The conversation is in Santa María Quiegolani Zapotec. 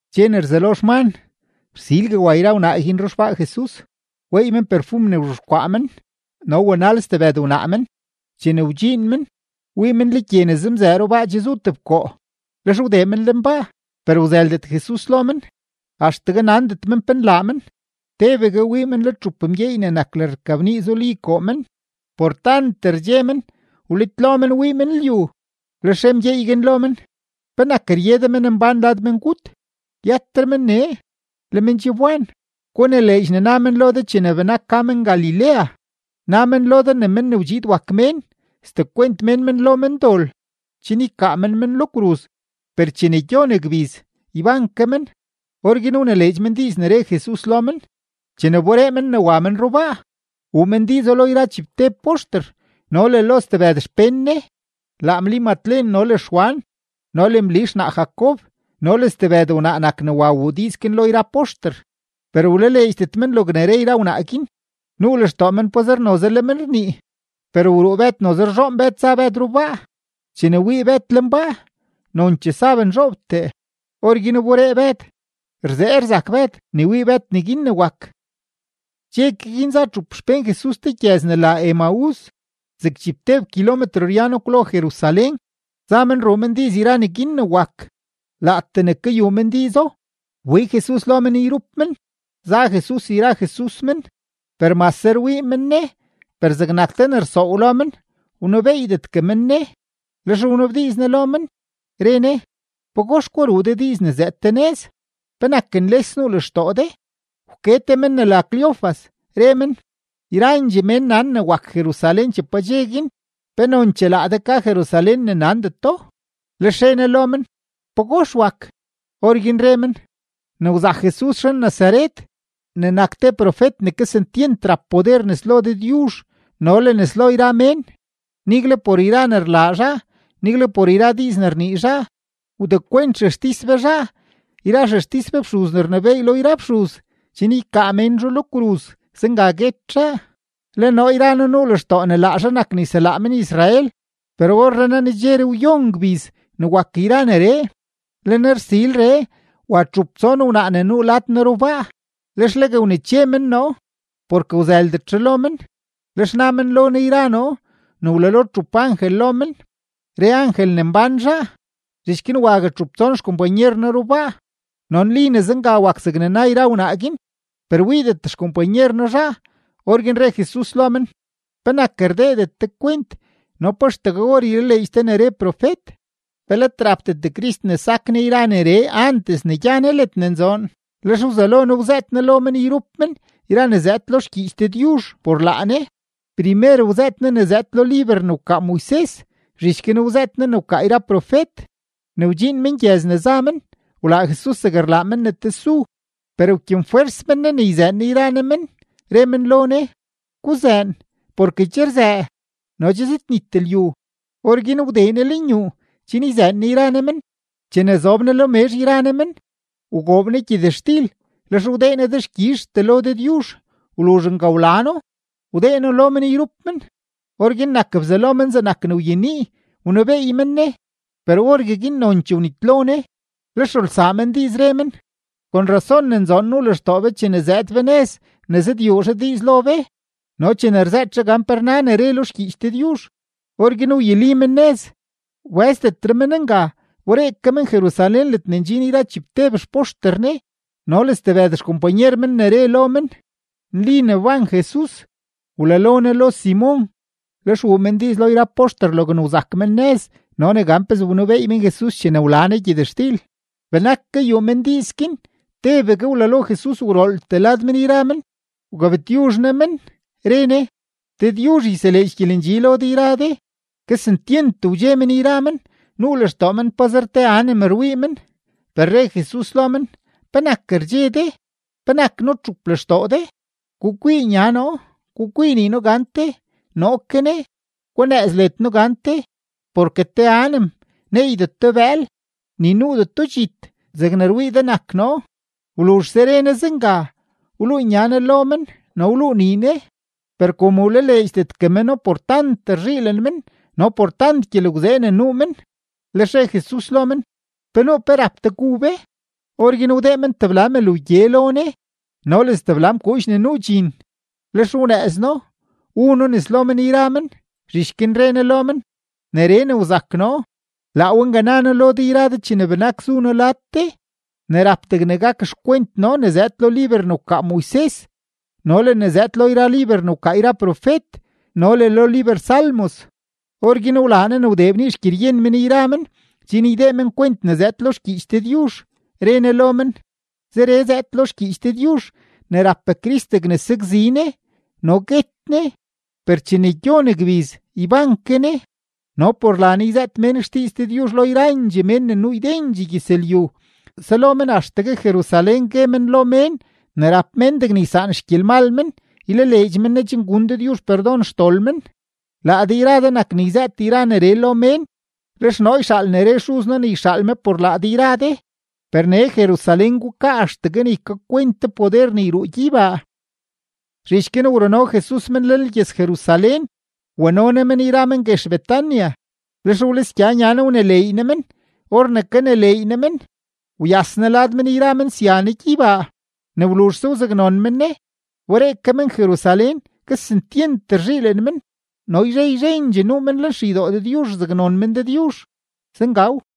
Dxe ne rzelo xman, rsilgue wa yra wnaa guin ruxbaa Jesus. Weey men perfum ne wzhexkwaa men, no wanal stebëd wnaa men. Chene wdxiin men, wii men le gye ne zemzëë rubaa che zu tebkoo. Lex wdee men lenbaa, per wzëldet Jesus lo men. Axtegue nandet men pe nlaa men. Tebegue wii men le txup mgyeey ne nak lërrkabnii zuli koo men. Por tant rdxe men, wlitlo men wii men lyu. Lex re mgyeey guin lo men: ―¿Penak rye de menmbán lad mengut? Yëtre men nee; le men che wban. Gunileedx ne na men lo de chene benak ka men Galilea. Na men lo de ne Men ne wdxiid wak Mén, sdekwent mén men lo mendol chen ykaa men men lo kruz, per chene gyon gbiz, yban ke men. Orguin wnileedx men diiz ne re Jesus lo men. Chene wberee men ne wa men rubaa, wuu men diizo lo yra chibteb poxter no le lo stebëd xpén Ne. Laa Mli Matlen no le Xwan no le Mli xnaa Jacob no le stebëd wnaa nak ne wa wuu diiz guin lo yra poxter. Per wlaleedxdet men logne re yra wnaa guin, nuu lextoo men pazer noze le men rnii. Per wruu Bëd, noze rzhoon Bëd za Bëd rubaa; chene wii Bëd lenbaa, nonchee saben zhoobtee. Orguin wberee Bëd, rzee rzak Bëd ne wii Bëd neguin ne wak. Dxe ke guin, za txup xpén Jesus te gyëz ne la Emaús, zeg chibteb kilometro ryano kwlo Jerusalén. Za men ruu men diiz yra neguin ne wak. Laatee ne kayuu men diizo, wbig Jesus lo men yrup men, za Jesus yra Jesus men. Per mase rwii men Ne, per zegnak te ne rsoow lo men, wnebeeydetgue men Ne. Lex wnabdiiz Ne lo men, re Ne: ―¿Pagox gwa ruu de diiz ne zëëd de nëz? ¿Penak nles nuu lextoo de? Wke te men ne la Cleofas, re men: ―Yrandxee mén nan ne wak Jerusalén che padxe guin. ¿Pe nonchee laa de ka Jerusalén ne nandeto? Lex re Ne lo men: ―¿Pagox wak? Orguin re men: ―Ne wzak Jesus zhan-Nazaret, ne nak te profet ne kesentyent rap poder nes lo Dëdyuzh no le nes lo yra mén, nigle por yra ne rlaa zhaa, nigle por yra diiz ne rnii zhaa. Wdekwent xextis be zhaa yra xextis be fxuz ne rnebééy lo yra fxuz chen ykaa mén zhaa lo kruz; zenga guet zhaa. Le noo yra noo nuu lextoo ne laa zhaa nak ne yselaa men-Israel, per orrenaa nedxeree wyon gbiz ne wak yra neree. Le nersilree, wa txup tson wnaa ne nuu lad noo rubaa, lex legue wneche men noo, porke wzëldet zhaa lo men, lex na men lo noo yra noo ne wlalo txup angel lo men, re angel ne mbán zhaa. Zhich guin wague txup tson xkompanyer noo rubaa, no nli ne zenga wak zegne na yra wnaa guin, per wiidet xkompanyer noo zhaa. Orguin re Jesus lo men: ―¿Penak rdeedet de kwent, no pa axtegue or ylaleedx de ne re profet? ¿Pe let rapdet Crist ne sak Ne yra neree antes ne gya Ne ledne nzoon? Lex wzelo Ne wzëët Ne lo men yrup men yra ne zëëd lo xgyiich Dëdyuzh por laa Ne. Primer wzëët Ne ne zëëd lo liber ne wkaa Moises, zhich guin wzëët Ne ne wkaa yra profet. Ne wdxiin men gyëz ne za men, wlaa Jesus zeg rlaa men ne tesu. Per wkyenfwers men Ne ne yzëën Ne yra ne men, re men lo Ne: ―Guzëën, porke che rzëë no che zëdnit lyu. Orguin wdee Ne lenyuu chen yzëën Ne yra Ne men. Chene che zob Ne lo mezh yra Ne men, wgoob Ne gyëtxtil, lex wdee Ne dexkyizhtee lo Dëdyuzh; wluzh nga wla No, wdee No lo men yrup men. Orguin nak bzalo men zegnak ne wyenii, wnebeey men Ne; per orgueguin nonchee wnitlo Ne. Lex rulsaa men diiz, re men: ―Kon rrazón ne nzoon nuu lextoo be chene zëëd be nëz ne zëdyuu zhaa diiz lo be no chene rzëët zhaa gan pe rna ne re lo xgyiich Dëdyuzh. Orguin wyuli men nëz, wbë́zdetre men nga. Wberee ke men Jerusalén ledne ndxin yra chibteb xpoxter Ne no le stebëd xkompanyer men ne re lo men: ―Nli ne wban Jesus, wlalo Ne lo Simon. Lex wuu men diiz lo yra poxter logne wzak men nëz no ne gan pezee wnebeey men Jesus chene wla Ne gyëtxtil. Benak kayuu men diiz guin, tebegue wlalo Jesus gwrooltee lad men yra men. Wgabtyuzh Ne men, re Ne: ―Dëdyuzh yseleedx gyelendxi lo de yra de. Kesentyent wdxe men yra men, nuu lextoo men pazer te anem rwii men. Per re Jesus lo men: ―¿Penak rdxe de? ¿Penak nutxup lextoo de? Gukwii nya noo, gukwii nii noo gante, noo ke ne. Gunëëz led noo gante, porke te anem neeydeto bëël, ni nuudeto dxit zegne rwii de nak noo. Wluzhse re Ne zenga, wluu nya Ne lo men no wluu nii Ne. Per kom wlaleedxdetgue meno por tant rzhiilen men no por tant gyelgwzee ne nuu men, lex re Jesus lo men: ―¿Pe nuu pe rap de gu be? Orguin wdee men tebla mël wgye lo Ne no le stebla mkuudx ne nuu dxin. Lex wnëëz No, wu No nes lo men yra men. Zhich guin re Ne lo men: ―Neree ne wzak noo, laa we nga na noo lo de yra de chene benak zu noo lad de: ne rap degne gak xkwent noo ne zëëd lo liber ne wkaa Moises no le ne zëëd lo yra liber ne wkaa yra profet no le lo liber Salmos. Orguin wlaa Ne ne wdee bnii xgyeryen men yra men chen ydee men kwent ne zëëd lo xgyiich Dëdyuzh. Re Ne lo men: ―Zeree zëëd lo xgyiich Dëdyuzh, ne rap Crist degne sakzi Ne no guet Ne; per chene gyon gbiz, yban ke Ne. No por la Ne yzëët mén xdiiz Dëdyuzh lo yrandxee mén ne nuu ydendxee gyëzlyu, selo men axtegue Jerusalén gue men lo mén ne rap mén degne ysaan xgyelmal mén, ylaleedx men Ne chen gun Dëdyuzh perdon xdol men. Laa de yra de nak ne yzëët yra neree lo mén. Lex noo yxaal ne re Xuz noo ne yxaal me por laa de yra de. Per nee Jerusalén gukaa axtegue ne ykakwent de poder ne yruu gyeybaa. Zhich guin wruno Jesus men lenlgyëz-Jerusalén, wano Ne men yra men guex Betania, lex wlisgya nya Ne wneleey Ne men. Or ne kaneleey Ne men, wyas Ne lad men sya Ne gyeybaa. Ne wluzhse wzaknon men Ne, wberee ke men Jerusalén, kesentyent rzhiilen men. No yzhe yzhendxee nuu men lenxeydoo Dëdyuzh rzaknon men Dëdyuzh. Zengaw.